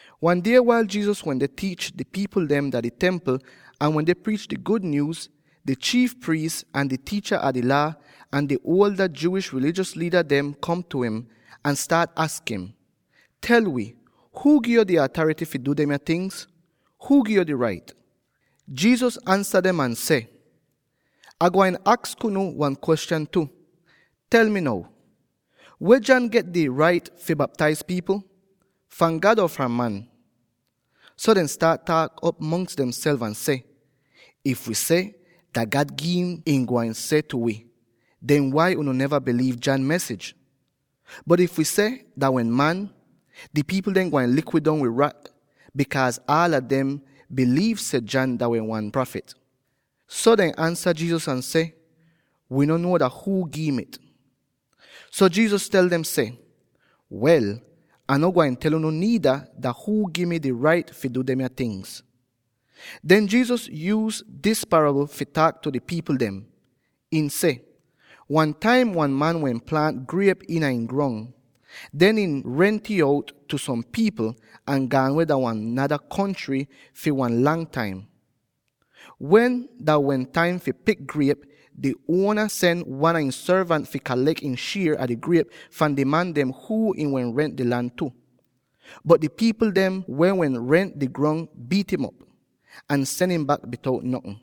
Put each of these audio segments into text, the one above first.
Wan die wail Jesus wende tiich di pipl dem dah di Templ ahn wende priich di gud nyuuz, di chiif priis, ahn di tiicha a di Laa, ahn di ada Jewish rilijos liida dem kom op tu im, ahn staat aks im, “Tel wi, huu gi'yo di atarity fi du demya tingz? Huu gi'yo di rait?” Jesus ansa dem ahn seh, “Ah gwain aks unu wan kwestyan tu. Tel mi now: Weh John get di rait fi baptaiz pipl? Fahn God or fahn man?” So dehn staat taak'op mongs demself ahn seh, “If wi seh, ‘Dah God gi'im,’ ihn gwain seh tu wi, ‘Den wai unu neva biliiv John mesij,’ bot if wi seh, ‘Dah wehn man,’ di pipl dem gwain lik wi dong wid rak, bikaaz aala dem wehn biliiv seh John dah wehn wan prafit.” So dehn ansa Jesus ahn seh, “Wii no nuo dah huu gi'im it.” So Jesus tel dem seh, “Wel, Ah no gwain tel unu niida dah huu gi mi di rait fi du demya tingz.” Den Jesus yuuz dis parabl fi taak tu di pipl dem. Ihn seh: “Wan taim wan man wehn plaant griep iina ihn grong. Den ihn rent'ih out tu som pipl, ahn gaan weh dah wan nada kontry fi wan lang taim. Wen dah wehn taim fi pik griep, di uona sen wan a ihn sorvant fi kalek ihn shier a di griep fahn di man dem huu ihn wehn rent di lan tu. Bot di pipl dem weh wehn rent di grong biit'im op, ahn sen im bak bitout notn.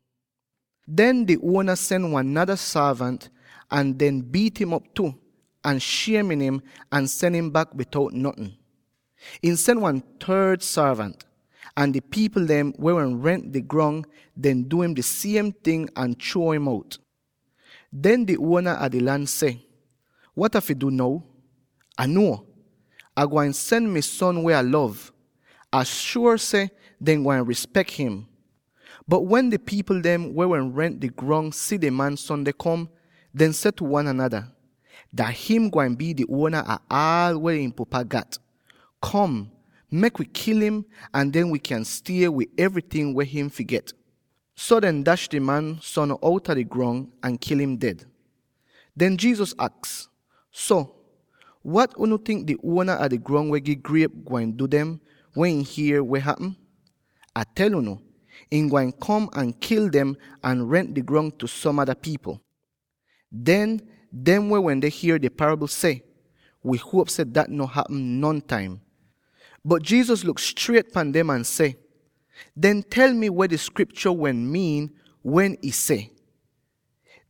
Den di uona sen wan nada sorvant, ahn dehn biit'im op tu, ahn shiemin'im, ahn sen im bak bitout notn. Ihn sen wan third sorvant, ahn di pipl dem, weh wehn rent di grong, dehn du im di siem ting ahn chruo im out. Den di uona a di lan seh, ‘Wat Ah fi du now? Ah nuo; Ah gwain sen mi son weh Ah lov. Ah shuor seh dehn gwain rispek him.’ Bot wen di pipl dem weh rent di grong si di man son deh kom, dehn seh tu wan anada, ‘Dah him gwain bii di uona ah aal weh ihn pupa gat. Kom, mek wi kil im, ahn den wi kyan stie wid evryting weh him fi get!’ So dehn dash di man son outa di grong, ahn kil im ded.” Den Jesus aks, “So, wat unu tink di uona a di grong weh gi griep gwain du dem, wen ihn hier weh hapm? Ah tel unu: ihn gwain kom ahn kil dem ahn rent di grong tu som ada pipl.” Den, dem weh wende hier di parabl seh, “Wi huop seh dat no hapm nontaim!” Bot Jesus luk striet pan dem ahn seh, “Den tel mi weh di Skriptyo wehn miin weh ih seh: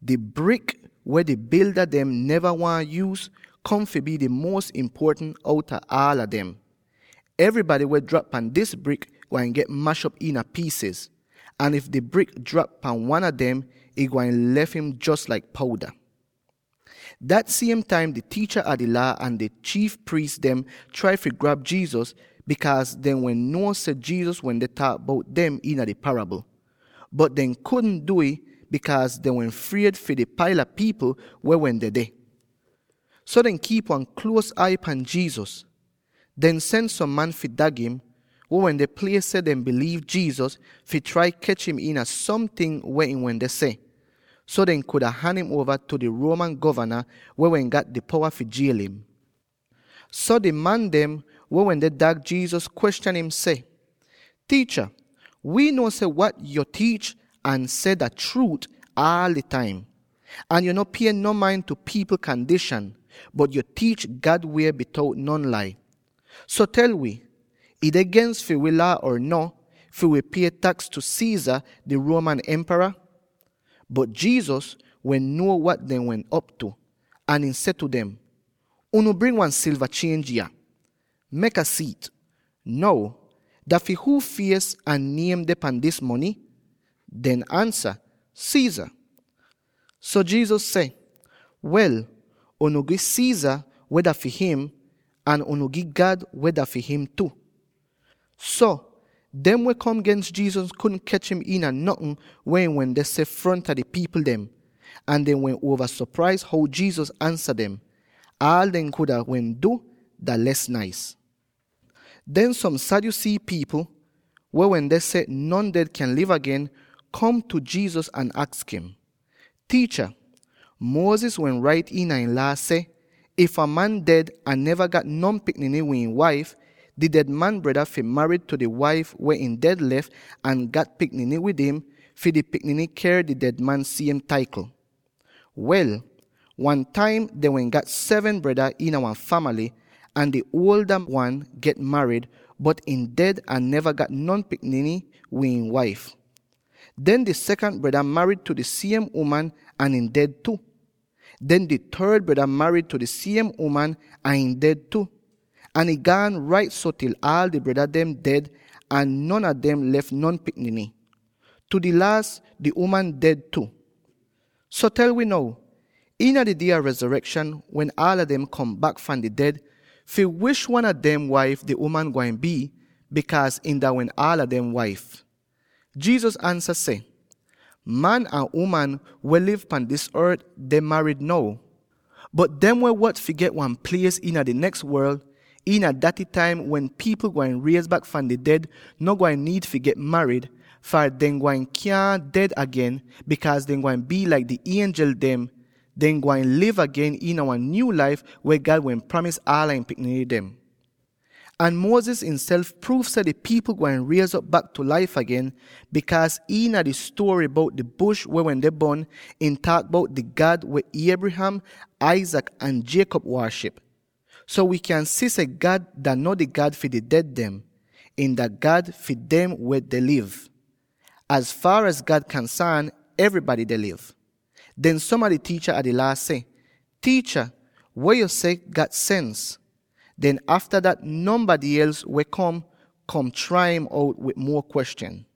‘Di brik, weh di bilda dem neva waahn yuuz, kom fi bii di muos impuotant outa aala dem.’ Evrybady weh drap pan dis brik gwain get mash'op iina piisiz, ahn if di brik drap pan wan a dem, ihn gwain lef im jos laik pouda.” Dat siem taim di tiicha a di Laa ahn di chiif priis dem trai fi grab Jesus, bikaaz dehn wehn nuo seh Jesus wende taak bout dem iina di parabl. Bot dehn kudn du'ih, bikaaz dehn wehn fried fi di paila pipl weh wehn dedeh. So dehn kiip wan kluos ai pan Jesus. Dehn sen som man fi dag im —weh wende plie seh dehn biliiv Jesus— fi trai kech im iina somting weh ihn wende seh, so dehn kuda han im uova tu di Roman govana, weh wehn gat di powa fi jiel im. So di man dem weh wende dag Jesus, kwestyan im seh, “Tiicha, wi nuo seh wat yo tiich ahn seh dah chruut aal di taim, ahn yo no pie no main tu pipl kandishan, bot yo tiich God wie bitout non lai. So tel wi: ih deh gens fi wi Laa or no, fi wi pie taks tu Caesar di Roman Empara?” Bot Jesus wehn nuo wat dehn wehn op tu, ahn ihn seh tu dem, “Unu bring wan silva chienj yah; mek Ah si'it. Now, dah fi huu fies ahn niem deh pahn dis mony?” Dehn ansa, “Caesar!” So Jesus seh, “Wel, unu gi Caesar weh dah fi him; ahn unu gi God weh dah fi him tu!” So, dem weh kom gens Jesus kudn kech im iina notn weh ihn wende seh fronta di pipl dem, ahn dehn wehn uova sopraiz how Jesus ansa dem. Aal dehn kuda wehn du dah les naiz. Den som Sadducee pipl —weh wende seh non ded kyaahn liv agen— kom tu Jesus, ahn aks im, “Tiicha, Moses wehn rait iina ihn Laa seh, ‘If wan man ded ahn neva gat non pikniny wid ihn waif, di ded man breda fi marid tu di waif weh ihn ded lef, ahn gat pikniny wid im, fi di pikniny ker di ded man siem taikl.’ Wel, wan taim dehn wehn gat seven breda iina wan famaly, ahn di uolda wan get marid, bot ihn ded ahn neva gat non pikniny wid ihn waif. Den di sekant breda marid tu di siem uman ahn ihn ded tu. Den di third breda marid di siem uman ahn ihn ded tu, ahn ih gaan rait so til aal di breda dem ded, ahn non a dem lef non pikniny. Tu di laas, di uman ded tu. So tel wi now: iina di die a rezorekshan, wen aala dem kom bak fahn di ded, fi wish wan a dem waif di uman gwain bii, bikaaz ihn dah wehn aala dem waif?” Jesus ansa seh, “Man ahn uman weh liv pan dis ort deh marid now. Bot dem weh wot fi get wan plies iina di neks worl —iina daty taim wen pipl gwain riez bak fahn di ded— no gwain niid fi get marid; far, dehn gwain kyaahn ded agen, bikaaz dehn gwain bii laik di ienjel dem; dehn gwain liv agen iina wan nyuu laif weh God wehn pramis aala ihn pikniny dem. “Ahn Moses ihnself pruuv seh di pipl gwain riez'op bak tu laif agen, bikaaz iina di stuory bout di bush weh wende bon, ih taak bout di God weh Abraham, Isaac ahn Jacob waaship. So wi kyan si seh God dah no di God fi di ded dem; ihn dah God fi dem weh deh liv. Az faar az God kansaan, evrybady deh liv.” Den som a di tiicha a di Laa seh, “Tiicha, weh yo seh gat sens.” Den afta dat, nonbady els wehn kom, kom trai im out wid muo kwestyan.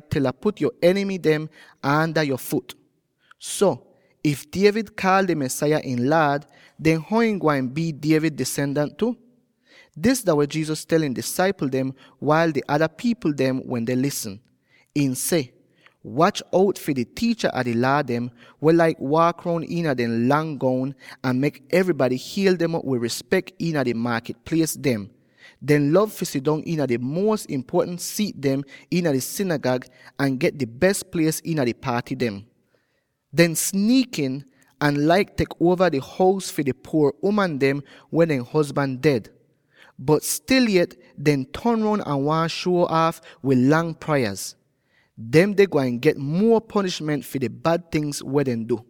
til Ah put yo enimy dem aanda yo fut.’ So, if David kaal di Mesaya ihn Laad, den how ihn gwain bii David disendans tu?” Dis dah weh Jesus tel ihn disaipl dem wail di ada pipl dem wende lisn. Ihn seh, “Wach out fi di tiicha a di Laa dem, weh laik waak roun iina dehn lang goun, ahn mek evrybady hiel dem op wid rispek iina di maakit plies dem. Dehn lov fi sidong iina di muos impuotant siit dem iina di sinigag ahn get di bes plies iina di paaty dem. Dehn sniikin, ahn laik tek uova di hous a di puor uman dem weh dehn hozban ded. Bot stil yet dehn ton roun ahn waahn shuo aaf wid lang prayaz. Demde gwain get muo ponishment fi di bad tingz weh dehn du.”